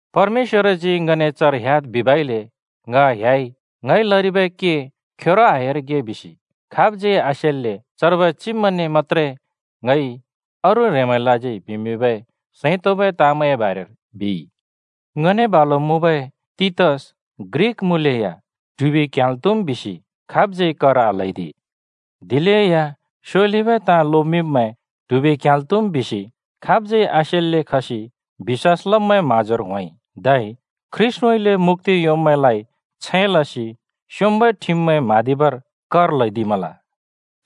परमेश्‍वरजी ङने चर ह्‍याद् बिबइले ङ ह्‍याइ। ङइ लरिबै के खेरो आह्‍यारिगे बिसि खाबज्यै आसेल्‍ले चर्बै चिब्मैंने मत्‍त्रे ङइ अरू ह्रेंमैंलाज्यै बिमिंबै सैं तोंबै ताँमैंए बारेर बिइ। ङने बालु मुँबै तीतस ग्रिक मुँलेया ट्हुबि क्ह्‍याल् त्हुम् बिसि खाबज्यै कर आल्हैदि। दिलेया स्योलिबै ताँ लोमिंब्मैं ट्हुबि क्ह्‍याल् त्हुम् बिसि खाबज्यै आसेल्‍ले खसि बिश्‍वास लब्मैंए म्‍हाँजोर होंइ। धै ख्रीष्‍टउँइँले मुक्‍ति योंब्मैंलाइ छैं लसि स्योंम्बै ठिममैं म्हाँदिबर कर ल्हैदिमल।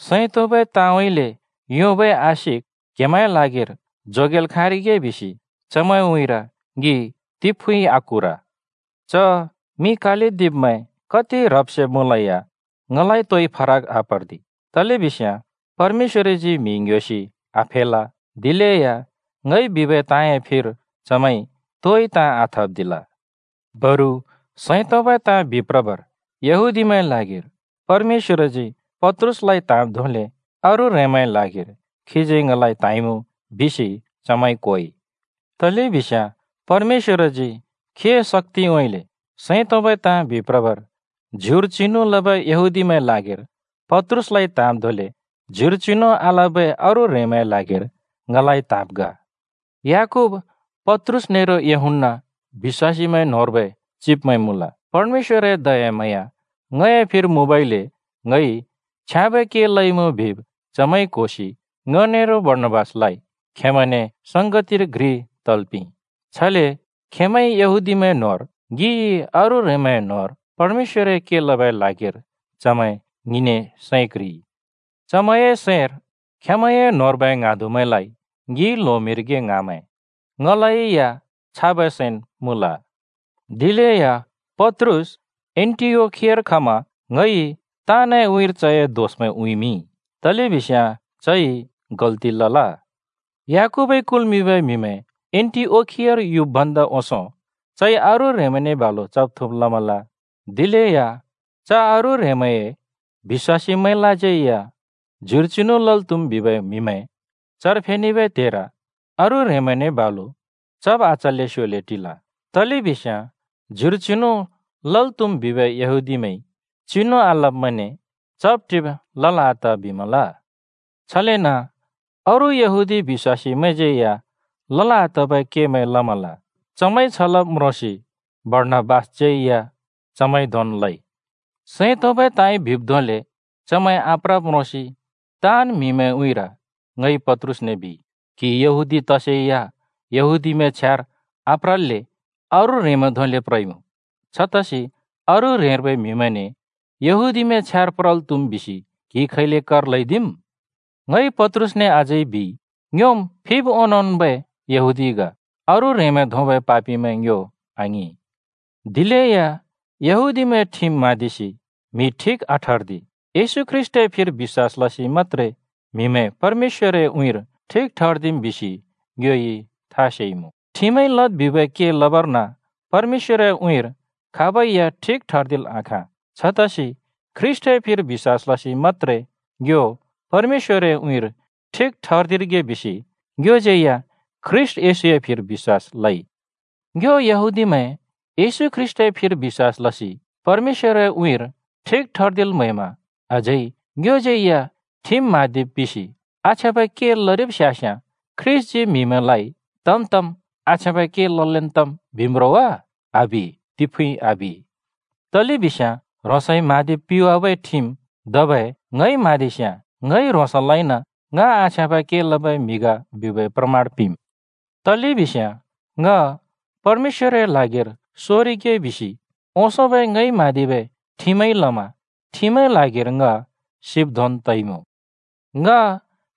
सैं तोंबै ताँउँइँले योंबै आशिक क्‍हेमैंए लागिर जोगेल् खाँरिगे बिसि चमैंए उँइँर ङि तिफुँइँ आकुर। च मिं कालदिब्मैं कति ह्रब् सेब् मुँलेया ङलाइ तोइ फरक आपर्दि, तलेबिस्याँ परमेश्‍वरजी म्हि ङ्ह्‍योसि आफेल! दिलेया ङइ बिबै ताँए फिर चमैंइ तोइ ताँ आथप्दिल। बरु सैं तोंबै ताँ बिप्रबर यहूदीमैंए ल्हागिर परमेश्‍वरजी पत्रुसलाइ त्हाँब् धोंले अरू ह्रेंमैंए ल्हागिर खीजी ङलाइ त्हाँइमुँ बिसि चमैंइ क्होइ। तलेबिस्याँ परमेश्‍वरजी खीए शक्‍तिउँइँले सैं तोंबै ताँ बिप्रबर ज्युर चिनु लबै यहूदीमैंए ल्हागिर पत्रुसलाइ त्‍हाँब् धोंले ज्युर चिनु आलबै अरू ह्रेंमैंए ल्हागिर ङलाइ त्‍हाँब् ग। याकूब, पत्रुस नेरो यूहन्‍ना बिश्‍वासीमैं न्होंर्बै चिब्मैं मुँल। परमेश्‍वरए दयाम्हाँया ङए फिर मुँबइले ङइ छ्याँबै के लइमुँ बिब् चमैंइ क्होसि ङ नेरो बारनाबासलाइ खेंमैंने संगतिर घ्रि तल् पिंइ। छले खेंमैंइ यहूदीमैं न्होंर, ङिइ अरू ह्रेंमैं न्होंर परमेश्‍वरए के लबै ल्हागिर चमैं ङिने सैं क्ह्रिइ। चमैंए सैंर खेंमैंए न्होंर्बै ङ्हाँदुमैंलाइ ङिइ ल्होमिंरिगे ङ्हाँमैं, ङलै या छाबै सैंन् मुँल। दिलेया पत्रुस एन्‍टिओखियार खमा ङइ ताँनए उँइँर चए दोषमैं उँइँमिंइ, तलेबिस्याँ चइ गल्‍ति लल। याकूबइ कुल्मिंबै म्हिमैं एन्‍टिओखियार युब् भन्दा ओंसों चइ अरू ह्रेंमैंने बालु चब् थुँब् लमल। दिलेया च “अरू ह्रेंमैंए बिश्‍वासीमैंलाज्यै या ज्युर चिनु लल् त्‍हुम्” बिबै म्हिमैं चर फेनेबै त्हेर अरू ह्रेंमैंने बालु चब आचल्‍ले स्‍योले टिल। तलेबिस्याँ [ज्युर चिनु लल् त्हुम् बिबै यहूदीमैंइ चिनु आलब्‍मैंने चब्-टिब् लल् आत बिमल।] छलेन अरू यहूदी बिश्‍वासीमैंज्यै या लल् आतबै केमैं लमल। चमैंइ छ लब् म्रोंसि बारनाबासज्यै या चमैंइ धोंन् लइ। सैं तोंबै ताँइ बिब् धोंले चमैं आप्रब् म्रोंसि ताँन् म्हिमैंए उँइँर ङइ पत्रुसने बिइ, “क्‍हि यहूदी तसेया यहूदीमैंए छ्यार आप्रल्‍ले अरू ह्रेंमैं धोंले प्रइमुँ। छतसि अरू ह्रेंर्बै म्‍हिमैंने यहूदीमैंए छ्यार प्रल् त्‍हुम् बिसि क्हिइ खैले कर ल्‍हैदिम्?” ङइ पत्रुसने अझै बिइ, “ङ्योम् फिब् ओंनोंबै यहूदी ग, अरू ह्रेंमैं धोंबै पापिमैं ङ्यो आङिं। दिलेया ‘यहूदीमैंए ठिम म्‍हाँदिसि म्हि ठिक आठर्दि, येशू ख्रीष्‍टए फिर बिश्‍वास लसि मत्‍त्रे म्हिमैं परमेश्‍वरए उँइँर ठिक ठर्दिम्,’ बिसि ङ्योइ था सेइमुँ। ठिमइ लद् बिबै के लबर्न परमेश्‍वरए उँइँर खाबै या ठिक ठर्दिल् आखाँ। छतसि ख्रीष्‍टए फिर बिश्‍वास लसि मत्‍त्रे ङ्यो परमेश्‍वरए उँइँर ठिक ठर्दिरिगे बिसि ङ्योज्यै या ख्रीष्‍ट येशूए फिर बिश्‍वास लइ। “ङ्यो यहूदीमैं येशू ख्रीष्‍टए फिर बिश्‍वास लसि परमेश्‍वरए उँइँर ठिक ठर्दिल् म्हैमा अझै ङ्योज्यै या ठिम म्हाँदिब् पिसि आछ्याँबै के लरिब् स्यास्याँ, ख्रीष्‍टजी म्हिमैंलाइ ‘तम् तम्, आछ्याँबै के ललेन् तम्’ बिम् रो वा? आबि! तिफुँइ आबि! तलेबिस्याँ ह्रोंसइ म्‍हाँदिब् पिवाबै ठिम धबै ङइ म्‍हाँदिस्‍याँ ङइ ह्रोंसलाइन ङ आछ्याँबै के लबै म्हि ग बिबै प्रमण पिंम्। तलेबिस्याँ ङ परमेश्‍वरए ल्हागिर सोरिगे बिसि ओंसोंबै ङइ म्हाँदिबै ठिमइ लमा ठिमए ल्हागिर ङ सिब् धोंन् तइमुँ। ङ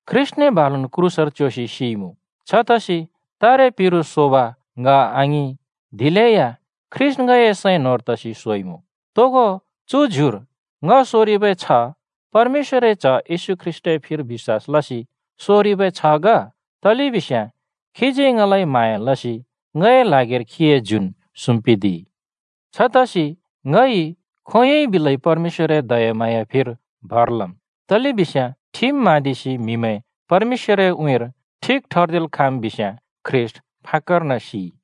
ख्रीष्‍टने बालुन् क्रूसर च्‍योसि सिइमुँ। छतसि तारे पिरु सोब ङ आङिं, दिलेया ख्रीष्‍ट ङए सैं न्‍होंर तसि सोइमुँ। तोगो चु ज्युर ङ सोरिबै छ्ह परमेश्‍वरए च्‍ह येशू ख्रीष्‍टए फिर बिश्‍वास लसि सोरिबै छ्ह ग, तलेबिस्याँ खीजी ङलाइ म्हाँया लसि ङए ल्हागिर खीए ज्युन् सुम्‍पिदिइ। छतसि ङइ खोंयोंइ बिलै परमेश्‍वरए दयाम्हाँयाए फिर भर लम्, तलेबिस्याँ ठिम म्‍हाँदिसि म्हिमैं परमेश्‍वरए उँइँर ठिक ठर्दिल् खाँम् बिस्‍याँ ख्रीष्‍ट फाक्‍कर्न सिइ!”